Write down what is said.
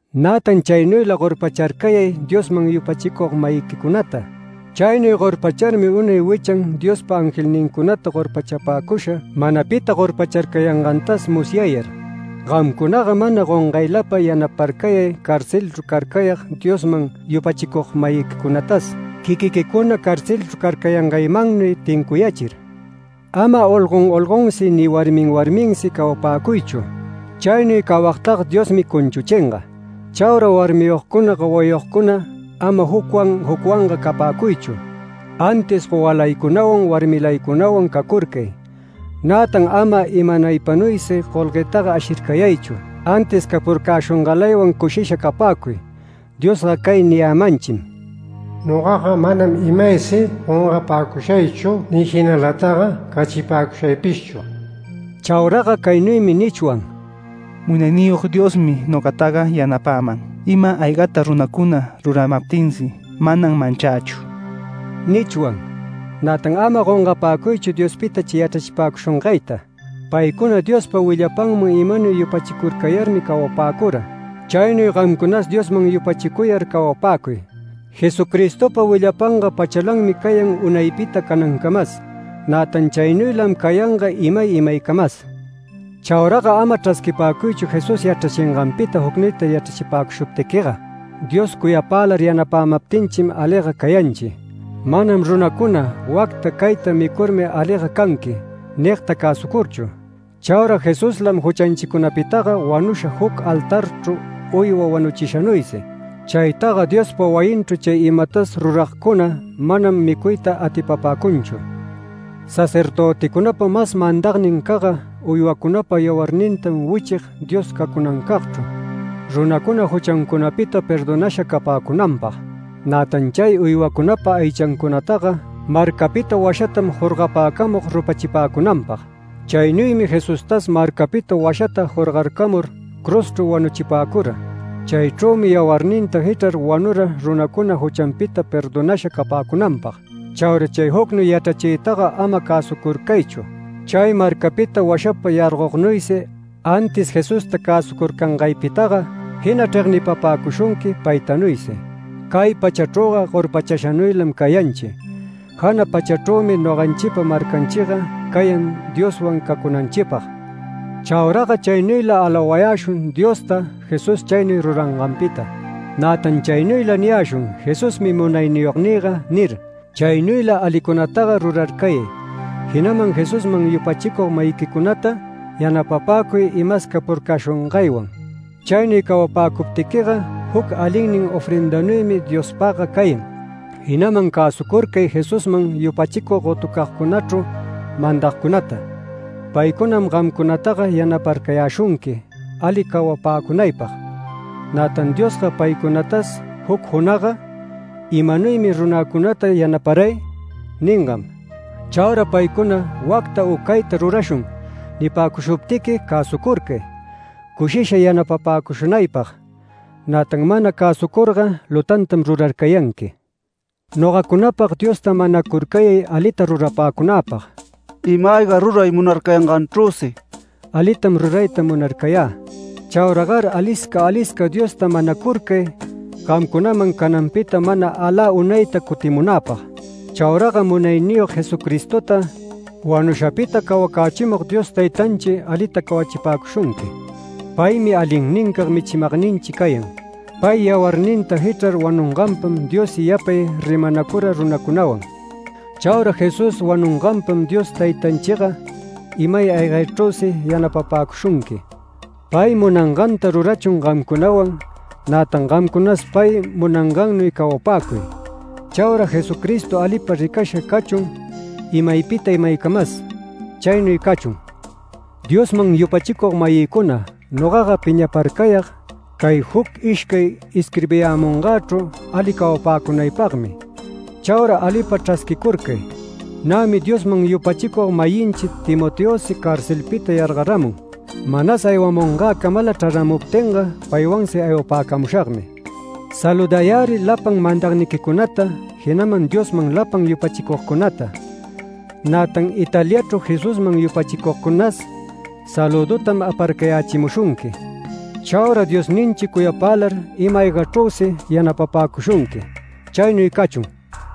Nätan chaynuyla gorpacharcayay Diosman yupachicug-mayiquicunata. Chaynuy gorpacharmi unay wichan Diospa angelnincunata gorpachapäcusha mana pita gorpacharcayangantas musyayar. Gamcunaga mana gongaylapa yanaparcayay carcelchru carcayag Diosman yupachicug-mayiquicunatas, quiquiquicuna carcelchru carcayangaymannuy tincuyächir. Ama olgon olgonsi ni warmi warminsi cawapäcuychu. Chaynuy cawagtaga Diosmi cunchuchinga. Chaura warmiyogcuna gowayogcuna ama jucwan jucwanga capäcuychu, antis gowalaycunawan warmilaycunawan cacurcay. Nätan ama imanaypanuysi golguetaga ashircayaychu antis capurcäshungalaywan cushisha capäcuy. Diosga cay niyämanchim: “Nogaga manam imaysi gongapäcushaychu ni jinalataga cachipäcushaypishchu”. Chauraga caynuymi nichwan: “Munayniyog Diosmi nogataga yanapäman, ima-aygata runacuna ruramaptinsi manam manchächu” nichwan. Nätan ama gongapäcuychu Diospita chay yachrachipäcushungayta. Paycuna Diospa willapanman imanuy yupachicurcayarmi cawapäcura. Chaynuy gamcunas Diosman yupachicuyar cawapäcuy. Jesucristopa willapanga pachalanmi cayan unaypita canancamas. Nätan chaynuylam cayanga imay imaycamas. Chauraga ama chrasquipäcuychu Jesús yachrachinganpita jucnuyta yachrachipäcushuptiquiga. Dios cuyapälar yanapämaptinchim aliga cayanchi, manam runacuna “Wacta cayta micurmi aliga canqui” nigta cäsucurchu. Chaura Jesuslam juchanchicunapitaga wanusha juc altarchru uywa wanuchishanuysi. Chaytaga Diospa wayinchru chay imatas ruragcuna manam micuyta atipapäcunchu. Sacerdöticunapa mas mandagnincagga uywacunapa yawarnintam wichig Dios cacunancagchru runacuna juchancunapita perdonasha capäcunanpag. Nätan chay uywacunapa aychancunataga marcapita washatam jorgapäcamug rupachipäcunanpag. Chaynuymi Jesustas marcapita washata jorgarcamur cruzchru wanuchipäcura. Chaychrümi yawarninta jichrar wanura runacuna juchanpita perdonasha capäcunanpag. Chaura chay jucnuy yachrachiytaga ama cäsucurcaychu, chay marcapita washapa yargognuysi, antis Jesusta cäsucurcangaypitaga jina chregnipapäcushunqui paytanuysi. Cay pachachrüga gorpachashanuylam cayanchi. Jana pachachrümi noganchipa marcanchiga cayan Dioswan cacunanchipag. Chauraga chaynuyla alawayäshun Diosta Jesús chaynuy ruranganpita. Nätan chaynuyla niyäshun “Jesusmi Munayniyognïga” nir. Chaynuyla alicunataga rurarcayay, jinaman Jesusman yupachicug-mayiquicunata yanapapäcuy imas capurcäshungaywan. Chaynuy cawapäcuptiquiga juc alinnin ofrendanuymi Diospagga cayan. Jinaman cäsucurcay Jesusman yupachicug gotucagcunachru mandagcunata. Paycunam gamcunataga yanaparcayäshunqui ali cawapäcunaypag. Nätan Diosga paycunatas juc junagga “¿Imanuymi runäcunata yanaparay?” ningam. Chaura paycuna “Wacta u cayta rurashun” nipäcushuptiqui cäsucurcay, cushisha yanapapäcushunaypag. Nätan mana cäsucurga lutantam rurarcayanqui. Nogacunapag Diosta manacurcayay alita rurapäcunäpag, ima-ayga ruray munarcayanganchrüsi alitam rurayta munarcayä. Chauragar alisca alisca Diosta manacurcay gamcunaman cananpita mana alä unayta cutimunäpag. Chauraga Munayniyog Jesucristota wanushapita cawacächimug Dios Taytanchi alita cawachipäcushunqui. Paymi alinnincag michimagninchi cayan. Pay yawarninta jichrar wanunganpam Diossi yapay rimanacura runacunawan. Chaura Jesús wanunganpam Dios Taytanchiga ima-aygachrüsi yanapapäcushunqui. Pay munanganta rurachun gamcunawan, nätan gamcunas pay munangannuy cawapäcuy. Chaura Jesucristo alipa ricasha cachun imaypita imaycamas. Chaynuy cachun. Diosman yupachicug-mayïcuna, nogaga piñaparcayag cay juc ishcay isquirbiyämungächru ali cawapäcunaypagmi. Chaura alipa chrasquicurcay. Nämi Diosman yupachicug-mayinchi Timoteosi carcelpita yargaramun, manas aywamungäcamala chraramuptinga paywansi aywapäcamushagmi. Saludayärï lapan mandagniquicunata jinaman Diosman lapan yupachicugcunata. Nätan Italiachru Jesusman yupachicugcunas salüdutam aparcayächimushunqui. Chaura Diosninchi cuyapälar ima-aygachrüsi yanapapäshunqui. Chaynuy cachun.